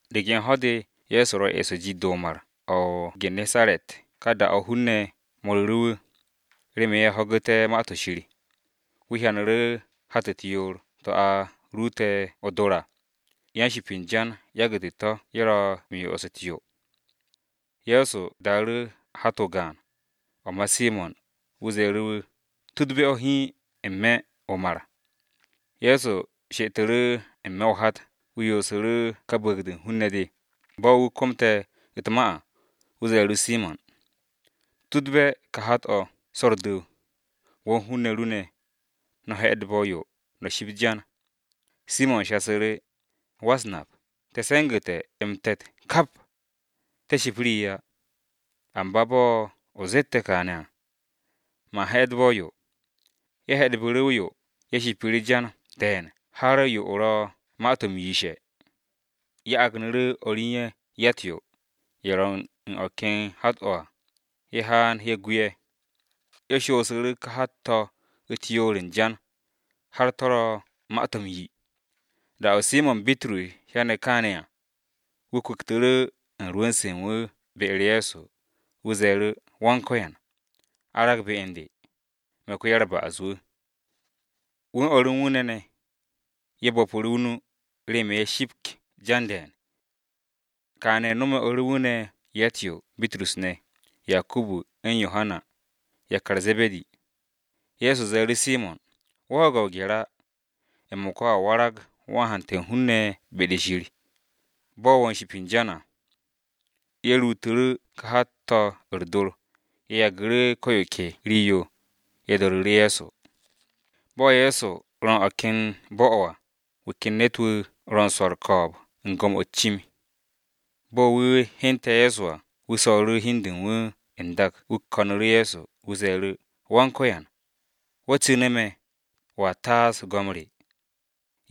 De ken ho̱-de Ye̱so ro̱ eso jit-de Mar-o̱ o-Gariri ka da-o̱ hun-ne̱ mo̱ru̱ru̱ wu̱, remen ye̱ ho̱gu̱té̱ Ma-to̱ Shir. Wu̱ hyanu̱ru̱ hat u̱t-yoor, to̱ a ruute̱ o-dor à, yan-ship u̱n jan yagu̱te̱ to̱ ye̱ ro̱ m-so'os u̱t-yo. Ye̱so daaru̱ hat-o̱ gaan, o̱ ma Simo̱n wu̱ ze̱e̱ru̱ wu̱ tudbe̱ o̱ hiin n-me̱ m-sa. Ye̱so she'etu̱ru̱ n-me̱ o-hat wu̱ yoosu̱ru̱ ka bu̱u̱g-de u̱n hun-ne̱ de. Bo̱ wu̱ komte̱ u̱t-ma à, wu̱ ze̱e̱ru̱ Simo̱n, “Tudbe̱ ka hat-o̱ so̱ u̱r-du̱w, wo̱ u̱n hun-ne̱ ru ne̱, no̱ he̱'e̱dbe̱ o-yo, no̱ shipt jan.” Simo̱n shasu̱ru̱, “Go̱s-wu̱, te̱ se̱ngu̱te̱ m-te̱t kap, te̱ ship rii á. Amba bo̱ o zette̱ kaane̱, man he̱'e̱dbe̱ o-yo.” Ye̱ he̱'e̱dbu̱ru̱ o-yo ye̱ shipu̱ru̱ jan de̱e̱n har yo-o̱ ro̱ ma-to̱ m-yishe̱. Ye̱ agnu̱ru̱ o̱r u̱n ye̱ ya-u̱t-yo, ye̱ ro̱ u̱n o̱ ken hat-o̱ à, ye̱ haan ye̱ gu ye̱. Ye̱ shoosu̱ru̱ ka hat-to̱ u̱t-yoor u̱n jan, har to̱ ro̱ ma-to̱ m-yi. Da-o̱ Simo̱n Bitrus hyane̱ kaane̱ à, wu̱ kwu̱ktu̱ru̱ u̱n rwu̱n-se u̱n wu̱ be-u̱r Ye̱so, wu̱ ze̱e̱ru̱, “Go̱s-wu̱, arag be u̱n de! Me̱ ko-ya-u̱r-ba'as-wu̱!” Wu̱ u̱n o̱r u̱n wu̱ ne̱, ye̱ bo̱pu̱ru̱ o-nu remen ye̱ shipk jan de̱e̱n. Kaane̱ no̱me̱ Bitrus u̱n o̱r u̱n wu̱ ne̱ ne̱ ya-u̱t-yo, Yakubu u̱n Yohana (yakar Ze̱be̱di). Ye̱so ze̱e̱ru̱ Simo̱n, “Wo̱ ho̱ge̱ o-gye̱r á, m-mo̱ka wo̱a warag wan-hante̱ u̱n hun-ne̱ be-de Shir, bo̱ wo̱ u̱n ship u̱n jan à.” Ye̱ ruutu̱ru̱ ka hat-to̱ u̱r-dor, ye̱ yagu̱ru̱ ko yo ke rii-yo, ye̱ do̱ru̱ru̱ Ye̱so. Bo̱ Ye̱so ro u̱n o̱ ken bo̱-o̱ à, wu̱ ken ne̱t-wu̱ ro u̱n swo̱ u̱r-ko̱o̱b u̱n go̱m-o̱ u̱t-cim. Bo̱ wu̱ hyente̱ Ye̱so à, wu̱ so̱ru̱ hi u̱n de u̱n wu̱ n-dak wu̱ ko̱nu̱ru̱ Ye̱so, wu̱ ze̱e̱ru̱, “Go̱s-wu̱, wo̱ cu̱ne̱, wo̱a taas go̱m re.”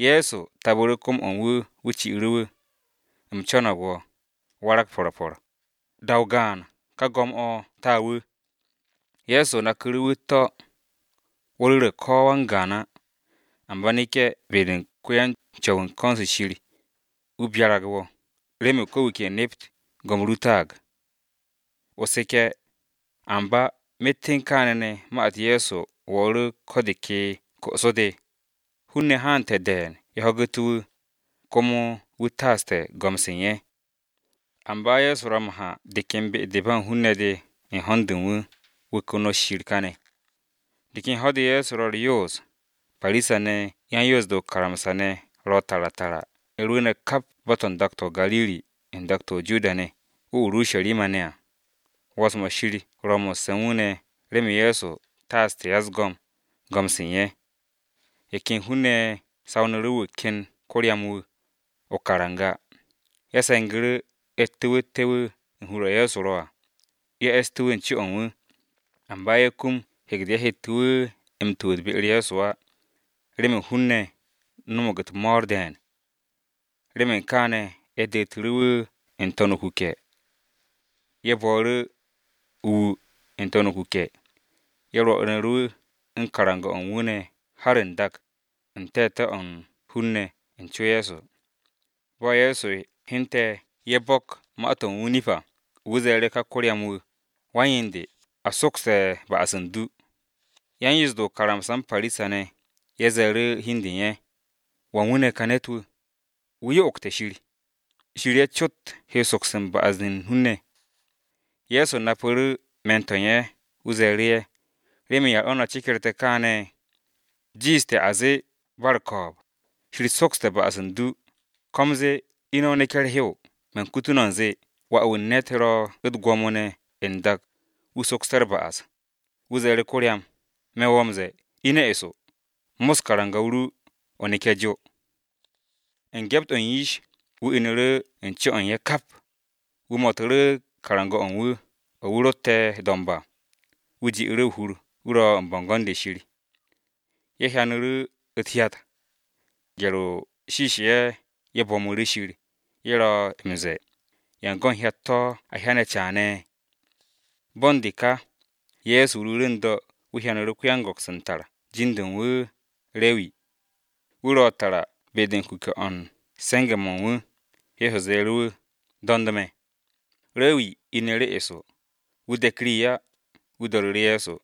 Ye̱so tapu̱ru̱ kom-o̱ u̱n wu̱, wu̱ ci'u̱ru̱ wu̱. “U̱m co̱no̱g. Warag po̱r po̱r!” Da-o̱ gaan, ka go̱m-o̱ ta wu̱. Ye̱so naku̱ru̱ wu̱ u̱t-to̱, “Wo̱ ru̱re̱ ko-wan-gaan á, amba neke̱ be-de u̱n wan-Co̱w u̱n ko̱n-se Shir, wu̱ byarag wo̱, remen ko̱ wu̱ ke nept go̱m-o ru taag, o seke̱ yar-mo̱ Mosa ze̱e̱ a seke̱ à.” Amba myet u̱n kaane̱, ma-u̱t Ye̱so wo̱o̱ru̱ ko̱ de ke ko'so-de, hun-ne̱ haante̱ de̱e̱n ye̱ ho̱gu̱te̱ wu̱, komo wu̱ taaste̱ go̱m-se u̱n ye̱. Amba Ye̱so ro̱ m-ha de ken be-de ba hun-ne̱ de, u̱n ho̱n-de u̱n wu̱, wu̱ konot Shir kane̱. De ken ho̱-de Ye̱so ro̱ u̱r-yoos, Parisa-ne̱ u̱n yan-Yoos-de o-karamsa ne̱ ro̱ tara tara ye̱ rwu̱u̱ne̱ kap bo̱-to̱ n-dak o-Gariri, n-dak o-Judiya ne̱, o-Urusharima ne̱ à. 'Wo̱ns-mo̱ Wan-Ko̱yan ro̱ mo̱sse̱ u̱n wu̱ ne̱ remen Ye̱so taasté̱ ya-u̱s-go̱m, go̱m-se u̱n ye̱. Ye̱ ken hun-ne̱ ye̱ sawnu̱ru̱ wu̱ ken ko-ryam-wu̱, o-karanga, ye̱ se̱ngu̱ru̱ ye̱ tu̱wu̱tte̱ wu̱ u̱n hur-o̱ Ye̱so ro̱ à, ye̱ e̱ste̱ wu̱ u̱n co-o̱ u̱n wu̱. Amba ye̱ kum hek-de ye̱ hette̱ wu̱ m-tu̱wu̱t be-u̱r Ye̱so á, remen hun-ne̱ no̱mo̱g u̱t-mo̱o̱r de̱e̱n. Remen kaane̱, ye̱ detu̱ru̱ wu̱ n-to̱n o-kuke̱, ye̱ bo̱o̱ru̱ o-wu n-to̱n o-kuke̱. Ye̱ rwo̱nu̱ru̱ wu̱ u̱n karanga-o̱ u̱n wu̱ har n-dak, u̱n te̱te̱-o̱ u̱n hun-ne̱ u̱n co Ye̱so. Bo̱ Ye̱so hyente̱ ye̱ bo̱k ma-to̱ u̱n wu̱ o-nip à, wu̱ ze̱e̱ru̱ ka ko-ryam-wu̱, “Wan-yen de, a sokste̱ ba'as u̱n du.” Yan-Yoos-de o-karamsa u̱n Parisa-ne̱, ye̱ ze̱e̱ru̱ hi u̱n de u̱n ye̱, “Wan wu̱ ne̱ ka ne̱t-wu̱, wu̱ yo'ogte̱ Shir! Shir ye̱ cot he soks ba'as-to̱ u̱n hun-ne̱!” Ye̱so napu̱ru̱ me̱n-to̱ ye̱, wu̱ ze̱e̱ru̱ ye̱, “¿Remen yan o̱ no̱ cekerte̱ kaane̱? ¿Jiishte̱ a zee ba u̱r-ko̱o̱b, ‘Shir sokste̱ ba'as u̱n du,’ ko u̱m zee, ‘Ine̱ o neke̱ u̱r-hew’? Man kutu no̱ u̱nze, Wà-wu̱ u̱n ne̱t ro̱ u̱t-gwo̱mo ne̱ n-dak wu̱ sokste̱ u̱r-ba'as.” Wu̱ ze̱e̱ru̱ ko-ryam, “Me̱ wo̱ m-ze̱e̱, ine̱ eso, mos karanga-o ru, o neke̱ jo!” U̱n gyept-o̱ u̱n yish, wu̱ inu̱ru̱ u̱n co-o̱ u̱n ye̱ kap, wu̱ mo̱tu̱ru̱ karanga-o̱ u̱n wu̱ o̱ wu̱ rotte̱ do̱mb à, wu̱ ji'u̱ru̱ o-hur wu̱ ro̱ u̱n bo̱ngo̱n-de Shir. Ye̱ hyanu̱ru̱ u̱t-hyat! Gye̱r-o shiishe̱ ye̱, ye̱ bo̱mu̱ru̱ Shir, ye̱ ro̱ m-ze̱e̱, “Yan go̱n hyat-to̱ a hyane̱ caane̱!” Bo̱ u̱n de ka, Ye̱so ruuru̱ n-do̱, wu̱ hyanu̱ru̱ ko-yan-go̱ks u̱n tar jin-de u̱n wu̱ Rewi, wu̱ ro̱ tara be-de u̱n kuke̱-o̱ u̱n se̱nge̱-mo̱ u̱n wu̱, Ye̱so ze̱e̱ru̱ wu̱, “Do̱nd me̱.” Rewi inu̱ru̱ eso, wu̱ dek rii á, wu̱ do̱ru̱ru̱ Ye̱so.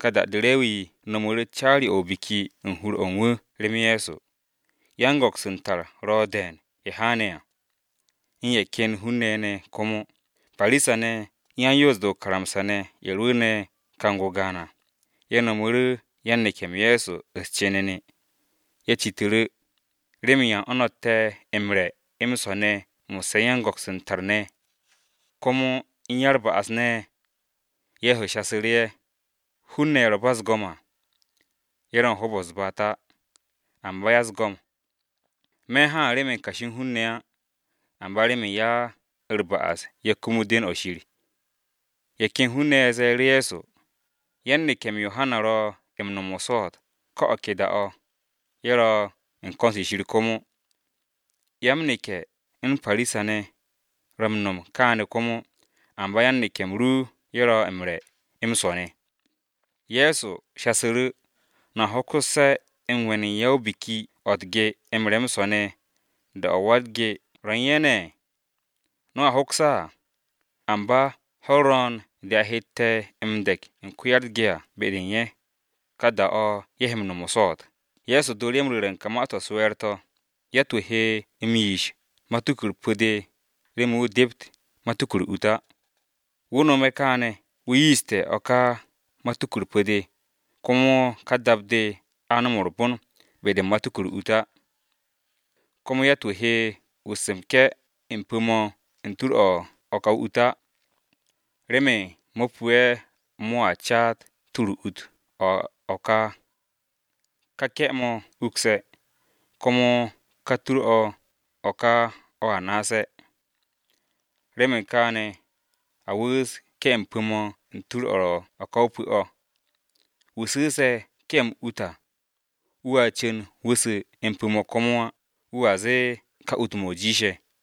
Ka da-de Rewi no̱mu̱ru̱ caari-o̱ o-biki u̱n hur-o̱ u̱n wu̱ rem Ye̱so, yan-go̱ks u̱n tar ro̱ de̱e̱n ye̱ haane̱ à, u̱n ye̱ ken hun-ne̱ ye̱ ne̱ komo. Parisa-ne̱ u̱n yan-Yoos-de o-karamsa ne̱ ye̱ rwu̱u̱ne̱ kang-o gaan à, ye̱ nomu̱ru̱ yan-neke̱-m Ye̱so u̱s-cenene. Ye̱ citu̱ru̱, “¿Remen yan o̱ no̱tte̱ m-re̱ m-swo̱ ne̱ mo̱sse̱ u̱n yan-go̱ks u̱n tar ne̱, komo u̱n ya-u̱r-ba'as ne̱?” Ye̱so shasu̱ru̱ ye̱, “Hun-ne̱ ye̱ ro̱ ba u̱s-go̱m á, ye̱ ro̱ u̱n hoob-o̱ u̱n ko-ya-u̱s-baat á, amba ya-u̱s-go̱m. Me̱ haan remen kashi u̱n hun-ne̱ á, amba remen ya-u̱r-ba'as-ye̱ waktu̱nte̱ be-de Shir.” Ye̱ ken hun-ne̱ ye̱ ze̱e̱ru̱ Ye̱so, “Yan-neke̱-m Yohana ro̱ m-no̱m o-swo̱o̱t ko̱ o̱ ke da-o̱ ye̱ ro̱ u̱n ko̱n-se Shir komo. Ya-m-neke̱ u̱n Parisa-ne̱ ro̱ m-nom kaane̱ komo, amba yan-neke̱-m ru ye̱ ro̱ m-re̱ m-swo̱ ne̱.” Ye̱so shasu̱ru̱, “¿No̱a hoksu̱sse̱ m-we̱n u̱n ya-o-biki o̱ u̱t-ge m-re̱ m-swo̱ ne̱, da-o̱ wa-u̱t-ge ro̱ u̱n ye̱ ne̱? No̱a hoks á! Amba ho̱-u̱r ro̱o̱n de a hette̱ m-de̱k u̱n wa-u̱t-ge à be-de u̱n ye̱, ka da-o̱ ye̱ he m-no̱m o-swo̱o̱t.” Ye̱so dooru̱ ye̱ m-ru̱re̱ ka ma-to̱ u̱s-we̱e̱r to̱: “Yatt-wu̱ he m-yiish matuku-u̱r pu̱-de remen wu̱ dept matuku u̱r-ut á. Wu̱ no̱me̱ kaane̱ wu̱ yiishte̱ o̱ ka matuku-u̱r pu̱-de, komo ka dap-de a nom u̱r-bon be-de u̱n matuku u̱r-ut á. Komo yatt-wu̱ he wu̱u̱s m-ke̱ m-pu̱ mo̱ u̱n tur-o̱ o-ka o-ut á, remen mo̱ pu'e̱ mo̱a caat tur o-ut o̱ o-ka, ka ke̱-mo̱ ukse̱, komo ka tur-o̱ o-ka o̱ naase̱. Remen kaane̱, a wu̱u̱s ke̱-m pu̱-mo̱ u̱n tur-o̱ o-ka o-pu̱ o̱! Wu̱ su̱u̱se̱ ke̱-m ut à, wu̱a cu̱n wu̱ su̱ m-pu̱ mo̱ komo á, wu̱a zee, ‘Ka ut-mo̱ jiishe̱.’”